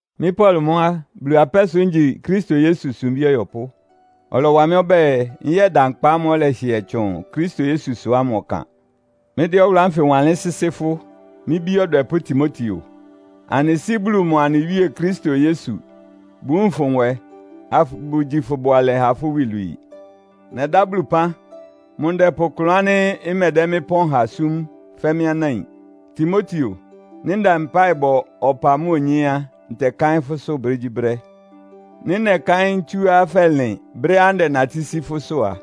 Mɩ́ Paulo mʋ́ á, Bulu apɛ́ sʋ ngyi Kristo Yesu sumbí ɔyɔpʋ́. Ɔlɔwa mɩ́ ɔbɛ́ɛ, nyɛ́da nkpa ámʋ́ʋ́ ɔlɛhɩɛ tsʋn Kristo Yesusʋ ámʋ ɔkan. Mɩ́dɛ́ ɔwʋlʋ́ ánfɩ wanlɩ́n sɩ́sɩ́ fʋ́, mɩ́ bí ɔdwɛpʋ́ Timoteo. Anɩ Sɩ́ Bulu mʋa anɩ Wíe Kristo Yesu bʋwúun fʋ nwɛ, abʋgyi fʋ bʋalɛ ha fʋ́ iwilwii. Nɛdá Bulu ɩpán. Mʋ ndɛpʋ klʋn ánɩ́ ɩmɛdɛ́ mɩ́ ɩpɔ́n ha súm, fɛ́ mɩ́ anáin. Timoteo, nɩ́ ndɛ mpáɩ bɔ ɔpa mʋ́a onyé á, ntɛkáɩ́n fʋ́sʋ́ brégyíbrɛ́. Nɩ́ nɛkáɩ́n ntsúá fɛlɩn brɛ́á ndɛnatɩ́ sí fʋ́sʋ́ a,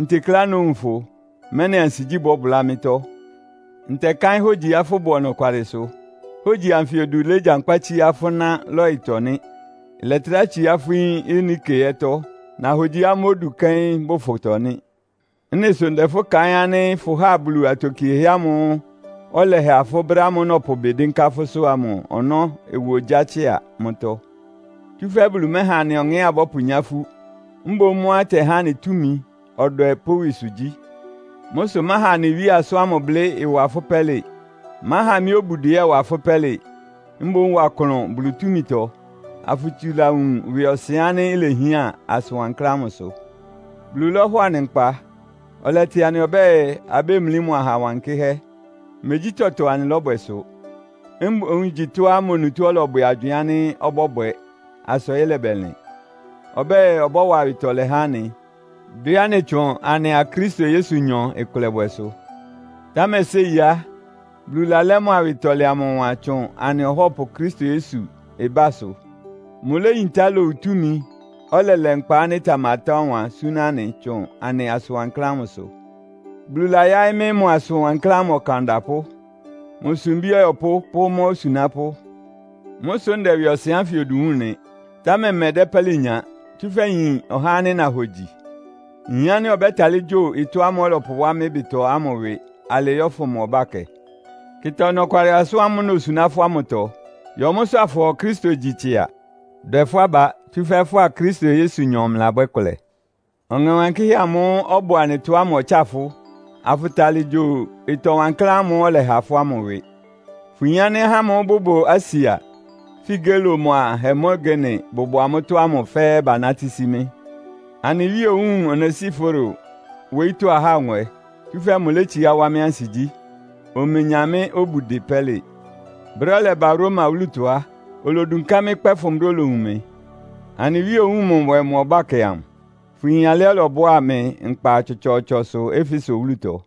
ntekleá nówun fʋ, mɛ́nɩ ansigyí bɔ́bʋlá mɩ́tɔ́. Ntɛkáɩ́n hógyiá fʋbʋ ɔnɔkwalɩsʋ. Hógyi anfɩ odu légyankpá tsíá fʋ́ ná Loitɔ nɩ́. Ɩlɛtrá tsiá fʋ́ yín Eunike ɛ́tɔ́. Nahogyiá mʋ́ odu bʋ fʋtɔ nɩ́. Ɩ́nɩ sʋ ndɛ fʋ́ kaɩ́n ánɩ́ fʋháa Bulu atokiehɛ́ ámʋ́ʋ́ ɔlɛha fʋ́ brɛ́ ámʋ́ʋ́ nɔpʋ ɩbɩ dɩ́nká fʋ́sʋ́ ámʋ ɔnɔ́ ɩwa ogyá tsɩ́a mʋ́tɔ́. Tsúfɛ́ Bulu mɛ́ha anɩ ɔŋɛ́á abɔ́pʋnyá ifú, mboún mʋ́á ɩtɛhá anɩ túmi, ɔdwɛ pʋ́ ɩwɩsʋgyí. Mʋ́ sʋ máha anɩ Wíe asʋ́n ámʋ blɩ́ ɩwa fʋ́ pɛ́lɩ. Máha mɩ́ obudɩ ɛ́ ɩwa fʋ́ pɛ́lɩ. Mboún wa klʋn Bulu túmitɔ, afʋtsula wun ɩwɩɔsɩn ánɩ́ ilehián asʋn wankláán ámʋ sʋ. Bulu lɔ́hɔ anɩ nkpa. Ɔlɛtɩ anɩ ɔbɛ́ɛ, abémlí mʋ aha wankɩ́hɛ́. Megyí tɔtɔ anɩlɔ́bwɛ sʋ. Mboún igyi tɔ́á mʋ onutó ɔlɔbwɛ agywɩɩn ánɩ́ ɔbɔ́bwɛ asa ɔyɩ́ lɛbɛlɩn. Ɔbɛ́ɛ, ɔbɔ́wa awɩtɔlɛ há anɩ, dwɛ́ anɩ tsʋn anɩa Kristo Yesunyɔ ɩkʋlɛbwɛsʋ. Támɛ séi á, Bulu lalɛ́ mʋ awɩtɔlɛ amʋ ɔwan tsʋn anɩ Ɔhɔ́pʋ Kristo Yesu ɩbásʋ. Mʋléyintá lowu túmi, ɔlɛlɛ nkpa ánɩ́ ɩtamatá ɔwan súná anɩ tsʋn asʋn wankláán ámʋsʋ. Bulu layáɩ́ mɩ́ mʋ asʋn wankláán ámʋ ɔkan ɔdapʋ́, mʋ́ sumbí ɔyɔpʋ́ pʋ́ mʋ́ osunápʋ́. Mʋ́ sʋ́ ndɛ ɩwɩɔsɩn ánfɩ odu wúun nɩ. Támɛ mmɛdɛ́ pɛ́lɩ nya, tsúfɛ́ nyin ɔhá ánɩ́ nahogyi. Nyin ánɩ́ ɔbɛ́talɩ́ gyo ɩtɔ́ ámʋ́ʋ́ ɔlɔpʋwá mɩ́ ɩbɩtɔ ámʋ ɩwɩ alɩɩ yɔ́fʋn mʋ ɔbákɛ. Kɩta ɔnɔkwalɩ asʋ́n ámʋ́ʋ́ nosuná fʋ́ ámʋtɔ. Yɔ mʋ́sʋ́ afʋhɔ Kristo gyi tsɩa. Dwɛ fʋ́ aba, tsúfɛ́ fʋ́a Kristo Yesunyɔ mlɩlabwɛ́ kʋlɛ. Ɔŋɛ Wankɩ́hɛ́ amʋ́ʋ́ ɔbʋ anɩtɔ ámʋ ɔtsáa fʋ́, afʋtalɩ gyo ɩtɔ wankláán ámʋ́ʋ́ ɔlɛha fʋ́ ámʋ ɩwɩ. Fʋyin ánɩ́ ahá ámʋ́ʋ́ bʋbʋ Asia, Figelo mʋ́a Hermogene bʋbʋ amʋ́tɔ́ amʋ fɛ́ɛ́ banátɩ́ sí mɩ́. Anɩ Wíe owúun Onesiforo wóyítɔ́ ahá nwɛ, tsúfɛ́ mʋlétsiá wá mɩ́ ansigyí. Omenya mɩ́ obudɩ pɛ́lɩ. Brɛ́á ɔlɛba Roma wúlutɔ á, olodunká mɩ́ kpɛ́fʋn brɛ́á olowun mɩ. Anɩ Wíe owúun mʋ nwɛ mʋ ɔbákɛ amʋ! Fʋyin alɩá ɔlɔbʋá mɩ nkpa tsɔtsɔɔtsɔsʋ Efeso wúlutɔ.